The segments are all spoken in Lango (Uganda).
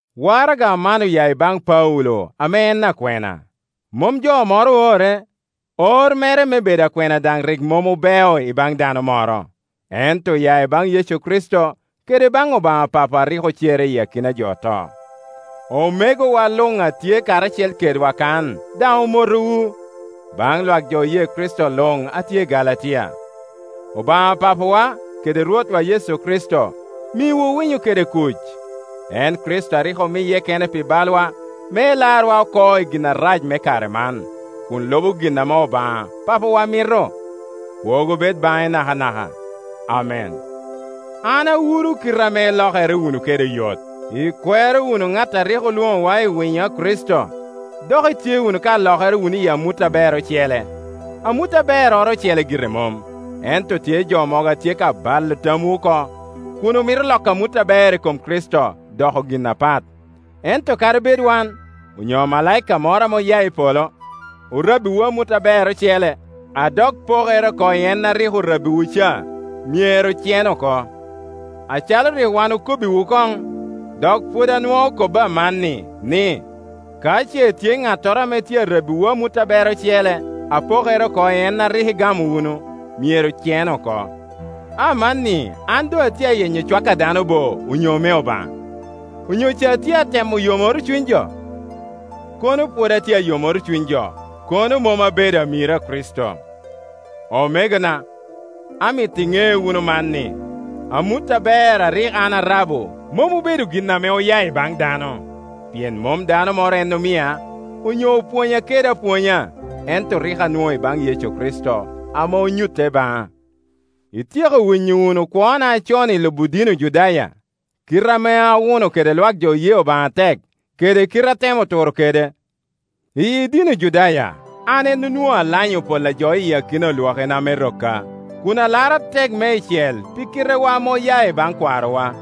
Waraga man oya i baŋ Paulo ame en akwena. Mom jo moro oore, or mere me bedo akwena daŋ rik mom obeo ibaŋ dano moro, ento oya ibaŋ Yecu Kricito kede ibaŋ Obaŋa Papo a rik ocere iyi akina a jo oto. Omegowa luŋ a tye karacel keda kan daŋ omotowu. Baŋ lwak jo oye Kricito luŋ a tye i Galatia: Obaŋa Papawa kede Rwotwa Yecu Kricito miwu winyo kede kuc, en Kricito a rik omiye kene pi balwa me elarwa oko i gin arac me kare man, kun lubo gin ame Obaŋa Papawa mito. Kwogo bed baŋe nakanaka. Amen. An awuro kite ame ilokere wunu kede oyot, ikwero wunu ŋat a rik olwoŋowa i winyo a Kricito, dok itye ka lokere wunu i amut aber ocele. Amut aberroro ocele gire mom, ento tye jo mogo a tye ka balo tamwu oko, kun omito loko amut aber i kom Kricito doko gin apat. Ento kadi bed wan, onyo amalaika moro ame oya i polo, orabbiwu amut aber ocele a dok pokere oko i en a rik orabbiwu ca, myero cen oko. Acalo rik wan okobbiwu koŋ, dok pwod anwoo kobo amanni, ni, ka ce tye ŋattoro ame tye arabbiwu amut aber ocele a pokere oko i en a rik igamo wunu, myero cen oko. Amanni an doŋ atye ayenyo cwak a dano bo, onyo me Obaŋa? Onyo ca atye atemo yomoro cuny jo? Kono pwod atye ayomoro cuny jo, kono mom abedo amiro a Kricito. Omegona, amito iŋe wunu man, ni, amut aber a rik an arabo mom obedo gin ame oya i baŋ dano. Pien mom dano moro en omia, onyo opwonya kede apwonya, ento rik anwoŋo i baŋ Yecu Kricito ame onyutte baŋa. Ityeko winyo wunu kwona acon i lubo dini Ojudaya, kite ame awuno kede lwak jo oye Obaŋa atek, kede kite atemo turo kede. Iyi dini Ojudaya an en onwoŋo alanyo pol a jo i kin olwakina me rokka, kun alaro atek meicel pi kitewa ame oya i baŋ kwarowa.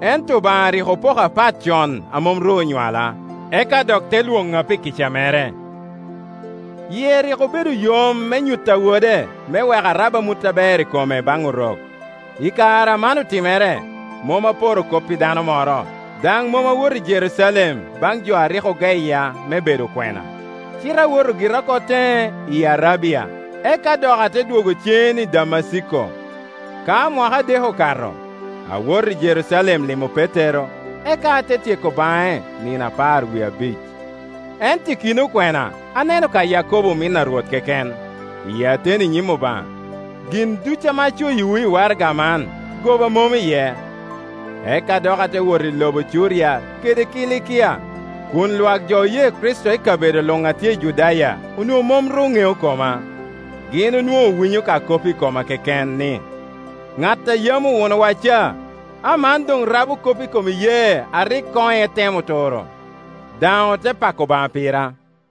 Ento Obaŋa rik opoka pat con a mom ru onywala, eka dok te lwoŋa pi kica mere. Yie rik obedo yom me nyutta Wode, me wek arab amut aber i kome baŋ Orok. I kare a man otimere, mom aporo kop i dano moro, daŋ mom awoto i Jerucalem baŋ jo a rik ogeya me bedo okwena, cite awoto gira oko teŋe, i Arabia, eka dok ate dwogo cen i Damaciko. Ka mwaka adek okato, awoto i Jerucalem limo Petero Petero: Leb Grik: Kepa, eka ate tyeko baŋe nino apar wie abic. Ento i kin okwena aneno ka Yakobo omin a Rwot keken. (Iyi ateni i nyim Obaŋa, gin duc ame acoyiwu i waraga man goba mom iye.) Eka dok ate wot i lobo Curia kede Kilikia, kun lwak jo oye Kricito i kabedo luŋ a tye i Judaya onwoŋo mom ru ŋeo koma. Gin onwoŋo owinyo ka kop i koma keken, ni, “Ŋat a yam owunowa ca, aman doŋ rabo kop i kom iyee a rik koŋ etemo turo”; daŋ ote pako Obaŋa pira.